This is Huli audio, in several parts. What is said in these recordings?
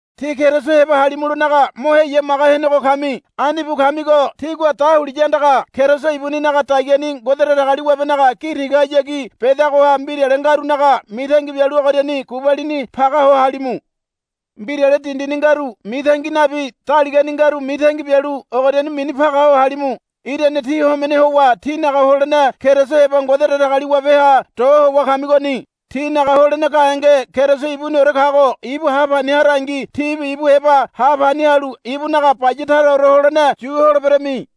Tí Keriso heba halimulonaga mo heyamaga henego kami. Ani bu kamigo tígua dahuliya andaga Keriso ibuninaga dagiani Ngode Datagaliwabenaga gi tigahayagi bedagoha mbirale ngarunaga mitangi bialu ogoriani gubalini paga ho halimu. Mbirale dindini ngaru mitangi nabi daligani ngaru mitangi bialu ogoriani mini paga ho halimu. Irane tí homene howa tínaga holene Keriso heba Ngode Datagaliwabeha do howa kamigoni. Tínaga holene gahenge Keriso ibuniore kago ibu ha pani harangi tíbi ibu heba ha pani halu ibunaga baya taraore holene yu holeberami.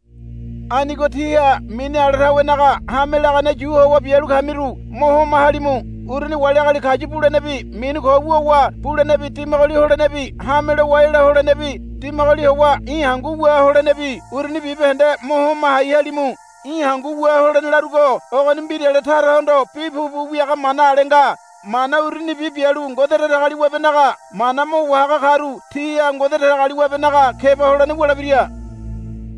Anigo tíha mini ala tawenaga hame lagane yu howa bialu kamiru mo homa halimu. Uruni wali agali kayu bulenebi mini ko wuwa bulenebi dimagoli holenebi hame lowa ela holenebi dimagoli howa í̠ hangu wua holenebi uruni bibahende mo homa hai halimu. Í̠ hangu wua holene larugo ogoni mbirale tarahondo bi pupu wiaga mana ale nga. Mana urunibi bialu Ngode Datagaliwabenaga mana mo wahaga karu tiha Ngode Datagaliwabenaga keba holene wulebira.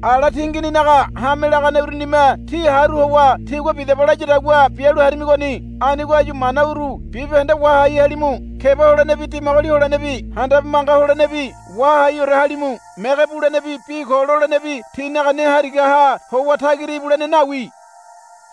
Ala tingininaga hame lagane urunime tí haru howa tigua, Bidaba, layadagua bialu harimigoni. Anigo áyu mana uru bibahende wahai halimu. Keba holenebi dimagoli holenebi handabe manga holenebi wahaiore halimu. Mege bulenebi bi ko lolenebi tínaga ne harigaha howa tagira ibulene nawi.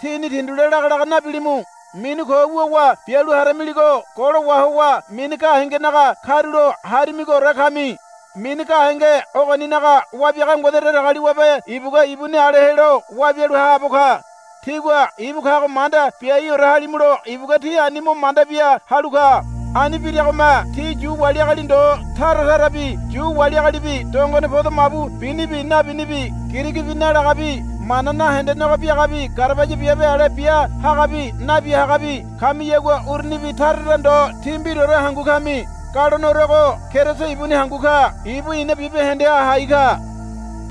Tíni tindule lagalaga nabilimu. Mini ko wuwa bialu haramiligo golo wahowa mini gahengenaga karulo harimigoore kami. Mini gahenge ogoninaga wabiaga Ngode Datagaliwabe ibugua ibuni ale helo wabialu haabo ka. Tígua ibu kago manda biaiore halimulo ibugua tí ani mo manda bia halu ka. Ani biragome tí Yu wali agali ndo taratarabi Yu wali agalibi dongone podo mabu binibi nabinibi Girigi bi nalagabi mana nahendenego biagabi garabaya biabe ale bia hagabi nabia hagabi kamiyagua urunibi taratara ndo tí mbiraore hangu kami. Galoneorego Keriso ibuni hangu ka. Ibu ina bibahendeha hai ka.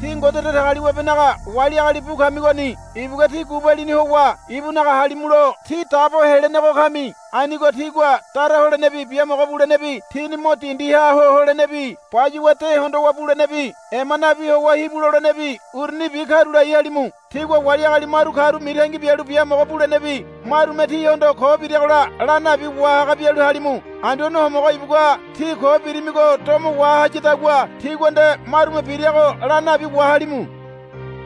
Tí Ngode Datagaliwabenaga wali agali bu kamigoni. Ibugua tí gubalini howa ibunaga halimulo tí dabo helenego kami. Anigo tígua dara holenebi biamogo bulenebi tíni mo dindiha ho holenebi bayuwa de hondowa bulenebi ema nabi howa hibu lolenebi urunibi karulai halimu. Tígua wali agali maru karu mitangi bialu biamogo bulenebi marume tíhondo ko biragola la nabi wahaga bialu halimu. Anduane Homogo ibugua tí ko birimigo domo wahayadagua tígua nde marume birago la nabi wahalimu.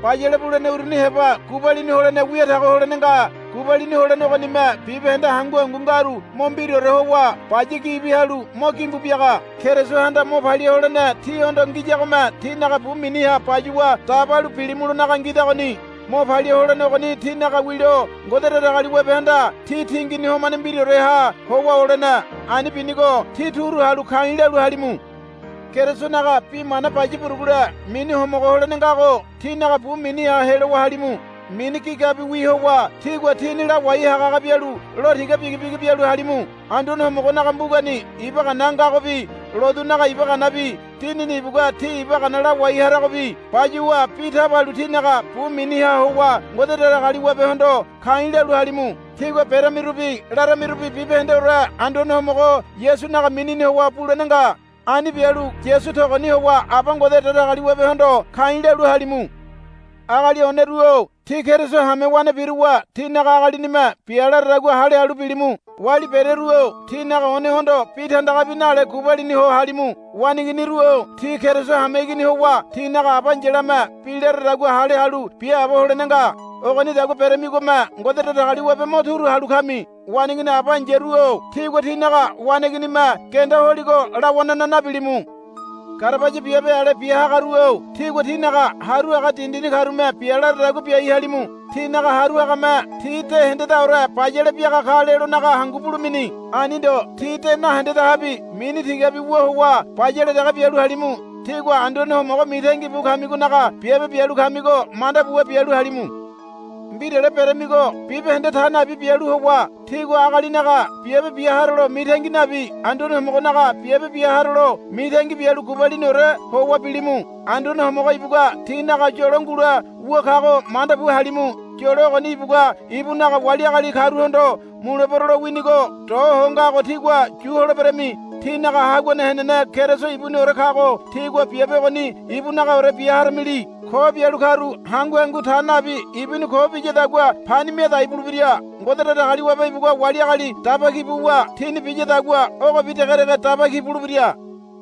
Bayale bulene uruni heba gubalini holene wia tago holene nga. Gubalini holene ogonime bibahende hangu hangu ngaru mo mbiraore howa baya gibi halu mo gimbu biaga. Kerisohanda mo palia holene tíhondo ngiyagome tínaga bu miniha bayuwa dabalu bilimulonaga ngidagoni. Mo palia holene ogoni tínaga wilo Ngode Datagaliwabehanda tí tingini homane mbiraoreha howa olene. Ani binigo tí turu halu ka̱i̱ lalu halimu. Kerisonaga bi mana baya burugule mini homogo holene ngago tínaga bu miniha helowa halimu. Mini gigabiwi howa tígua tíni lawai hagahaga bialu lo tiga bigibigi bialu halimu. Anduane Homogonaga mbugani iba gana ngagobi lotunaga iba ganabi Dinini ibugua tí iba gana lawai haragobi bayuwa bi tabalu tínaga bu miniha howa Ngode Datagaliwabehondo ka̱i̱ lalu halimu. Tígua beramirubi laramirubi bibahendeore Anduane Homogo Yasunaga minini howa bulene nga. Ani bialu Yasu togoni howa Aba Ngode Datagaliwabehondo ka̱i̱ lalu halimu. Agali oneru-o tí Keriso hamewane biruwa tínaga agalinime bia laradagua hale halu bilimu. Wali bereru-o tínaga onehondo bi tandagabi nale gubalini ho halimu. Waneiginiru-o tí Keriso hameigini howa tínaga aba ai̱yalame bi laradagua hale halu biaabo holene nga. Ogonidagua beremigome Ngode Datagaliwabe mo turu halu kami. Waneigini aba ai̱yaru-o tígua tínaga waneiginime genda holigo lawanana nabilimu. Garabaya biabe ale bia hagaru-o tígua tínaga haru haga dindini karume bia laradagua biai halimu. Tínaga haru hagame tí de hendedaore bayale biaga ka lelonaga hangu bulemini. Ani ndo tí de nahendedahabi mini tigabi wu howa bayale dege bialu halimu. Tígua Anduane Homogo mitangi bu kamigonaga biabe bialu kamigo manda buwa bialu halimu. Mbirale beramigo bibahende ta nabi bialu howa tígua agalinaga biabe bia harolo mitangi nabi Anduane Homogonaga biabe bia harolo mitangi bialu gubaliniore howa bilimu. Anduane Homogo ibugua tínaga yolo ngule wu kago manda bu halimu. Yolo ogoni ibugua ibunaga wali agali karuhondo mulebero lowinigo do ho ngago tígua yu holeberami. Tínaga Haguane henene Keriso ibuniore kago tígua biabe ogoni ibunagaore bia haramili. Ko bialu karu hangu hangu ta nabi ibuni ko biyadagua pani miadai bulebira. Ngode Datagaliwabe ibugua wali agali daba ki buwa tini biyadagua ogobi degedege daba ki bulebira.